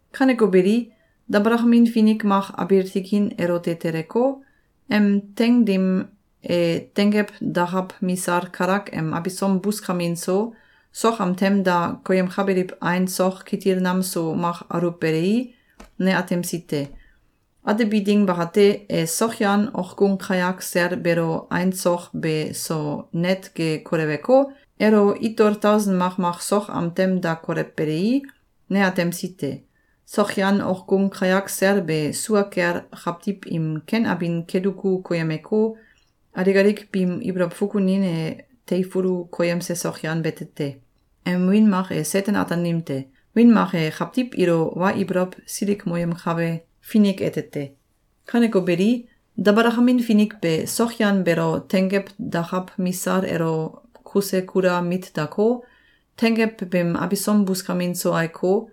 Kaneko beli, dabalakamin finik mak abiil tikin elote teleko, em teing dim e tenggew dakaw misal kalak em abisom buskamin so, sok am tem da koyemkabiliw ain sok kitil nam so mak aluwbelei, ne atemsi te. Atebi ding bakate, e sokyan okgung kayak sel beelo ain sok be so net ge koleweko, elo itol tausen makmak sok am tem da kolewbelei, ne atemsi te. Sokyan okgung kayak sel be sua kel kawtiw im ken abin keduku koyemeko, alik alik biim ibolow fukunin e teifulu koyemse sokyan bete te. Em wiin mak e Seten-Ataanim te. Wiin mak e “Kawtiw ilo Wa Ibolow Silikmoyemkabe Finik” ete te. Kaneko beli, dabalakamin finik be sokyan beelo tenggew dakaw misal elo kuse kula mit dako, tenggew beem abisom buskamin so aiko,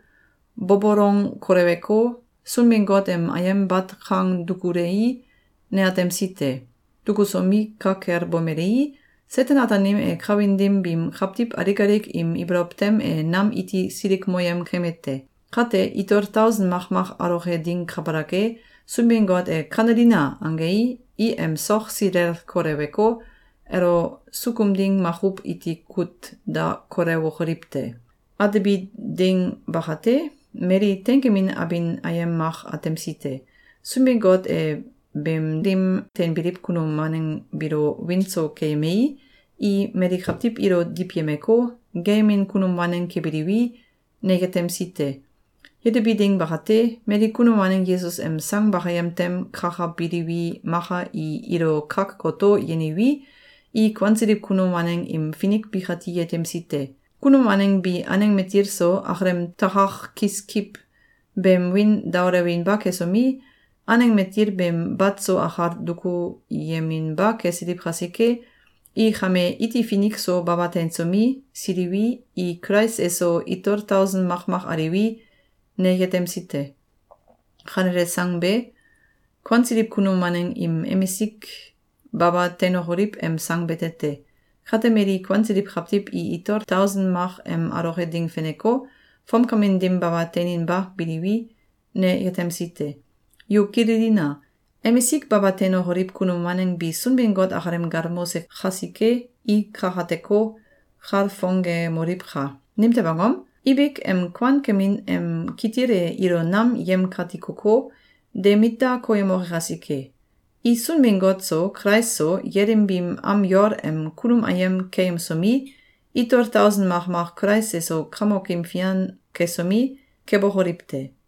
bobolong koleweko, Sunbin-Got em ayem bat kang dukulei, ne atemsi te. Dukusomi, ka kel bomelei, Seten-Ataanim e kawin dim biim kawtiw alik alik im ibolow tem e nam iti silikmoyem keme te. Kate, itol tausen makmak aloke ding kabalak e, Sunbin-Got e “Kanelina!”, angei, i em sok silel koleweko, elo sukum ding makuw iti kut da kolewokoliw te. Atebi ding bakate, mali teinkemin abin ayem mak atemsi te. Sunbin-Got e beem dim teinbiliw kunum waneng biilo wiin so keyemei, i mali kawtiw ilo diwyemeko, geeyemin kunum waneng kebiliwi, ne yetemsi te. Yetebi ding bakate, mali kunum waneng Yesus em sang bakayem tem kakabiliwi, maka i ilo kak goto yeniwi, i kuansiliw kunum waneng im finik bikati yetemsi te. Kunum waneng bi aneng matil so, akalem takak kiskiw beem wiin daolewinba kesomi, aneng matil beem bat so akal dukuyeminba kesiliw kasike, i kame iti finik so baba teinsomi, siliwi, i Kulais eso itol tausen makmak aliwi, ne yetemsi te. Kanele sang be, kuansiliw kunum waneng im emisik baba teinokoliw em sang bete te. Kate mali kuansiliw kawtiw i itol tausen mak em aloke ding feneko, fomkamin dim baba teininba biliwi, ne yetemsi te. Yu kililina! Emisik baba teinokoliw kunum waneng bi Sunbin-Got akalem galmolse kasike, i kakateko, kalfongemoliwka! Nimtew angom? Ibik em kuankemin em kitil e ilo nam yemkatikoko, de mit da koyemoke kasike. I Sunbin-Got so, Kulais so, yelim biim am yol em kunum ayem keyemsomi, itol tausen makmak Kulais eso kamokim fian kesomi, kebokoliw te.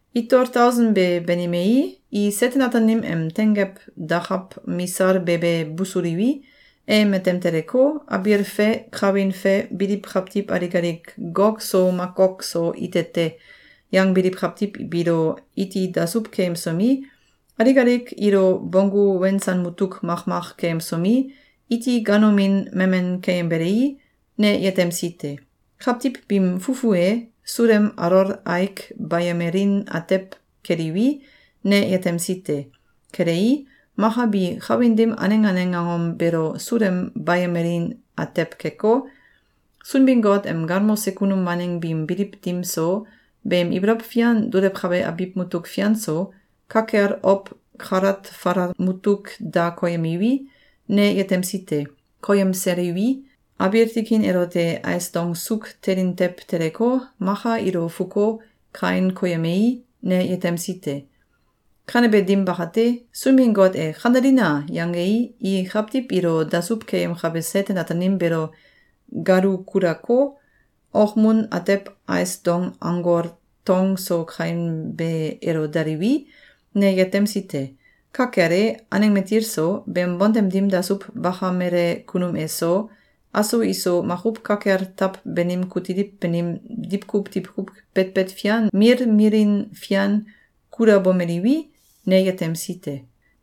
Itol tausen be banimei, i Seten-Ataanim em tenggew dakaw misal be be busuliwi, e matem teleko, abiil fe kawin fe biliw kawtiw alik alik “Gog so Magog so ite te!” yangbiliw kawtiw biilo iti dasuw keyemsomi, alik alik ilo bonggu wensan mutuk makmak keyemsomi, iti ganomin mamen keyembelei, ne yetemsi te. Kawtiw biim fu fu e, sulem alol aik bayemelin atew keliwi, ne yetemsi te. Kelei, maka bi kawin dim aneng aneng angom beelo sulem bayemelin atew keko, Sunbin-Got em galmose kunum waneng biim biliw dim so, beem ibolow fian dulewkabe abiw mutuk fian so, ka kel ow kalat falal mutuk da koyemiwi, ne yetemsi te. Koyemseliwi, abiil tikin elote ais dong suuk telin tew teleko, maka ilo fuko, kain koyemei, ne yetemsi te. Kanebe dim bakate, Sunbin-Got e “Kanelina!”, yangei, i kawtiw ilo dasuw keyemkabe Seten-Ataanim beelo galu kulako, okmun atew ais dong anggol tong so kainbe elo daliwi, ne yetemsi te. Ka kel e, aneng matil so, beem bontem dim dasuw bakamele kunum eso, aso iso makuw ka kel taw banim kutiliw banim diwkuw diwkuw betbet fian milmilin fian kulabomeliwi, ne yetemsi te.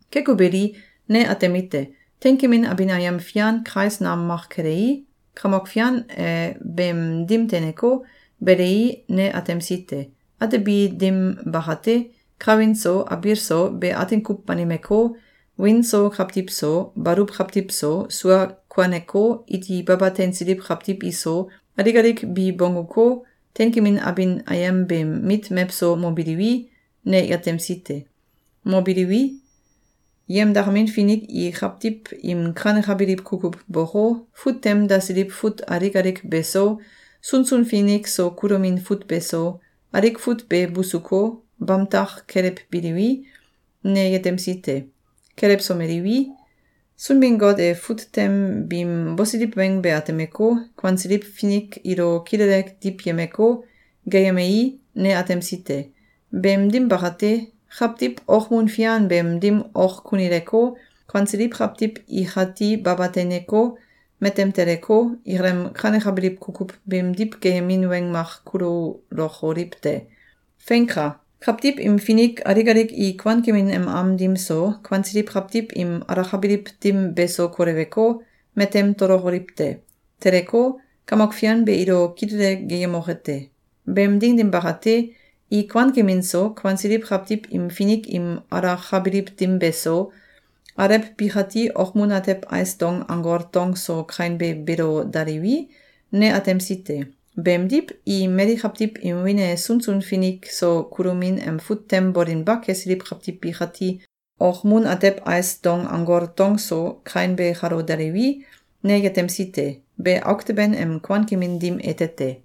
Keko beli, ne atemite: Teinkemin abin ayem fian kais nam mak kelei, Kamok Fian e beem dim teineko, belei, ne atemsi te. Atebi dim bakate, kawin so, abiil so, be atin kuw banimeko, wiin so kawtiw so, baluw kawtiw so, sua kuaneko, iti baba teinsiliw kawtiw iso, alik alik bi bongguko, teinkemin abin ayem beem mit mewso mobiliwi, ne yetemsi te. Mobiliwi, yemdakamin finik i kawtiw im kanekabiliw kukuw boko, fut tem dasiliw fut alik alik beso, sunsun finik so kulomin fut beso, alik fut be busuko, bamtak kelewbiliwi, ne yetemsi te. Kelewsomeliwi, Sunbin-Got e fut tem biim bosiliw weng be atemeko, kuansiliw finik ilo kilele diwyemeko, geeyemei, ne atemsi te. Beem dim bakate, kawtiw okmun fian beem dim ok kunileko, kuansiliw kawtiw ikati baba teineko, matem teleko, ikalem kanekabiliw kukuw beemdiw geeyemin weng mak kululokoliw te. Feinka! Kawtiw im finik alik alik i kuankemin em am dim so, kuansiliw kawtiw im alakabiliw dim beso koleweko, matem tolokoliw te. Teleko, Kamok Fian be ilo kilele geeyemoke te. Beem ding dim bakate, i kuankemin so, kuansiliw kawtiw im finik im alakabiliw dim beso, alew bikati okmun atew ais dong anggol tong so kainbe beelo daliwi, ne atemsi te. Beemdiw, i mali kawtiw im wiin e sunsun finik so kulomin em fut tem bolinba kesiliw kawtiw bikati okmun atew ais dong anggol tong so kainbe kalo daliwi, ne yetemsi te. Be auk teben em kuankemin dim ete te.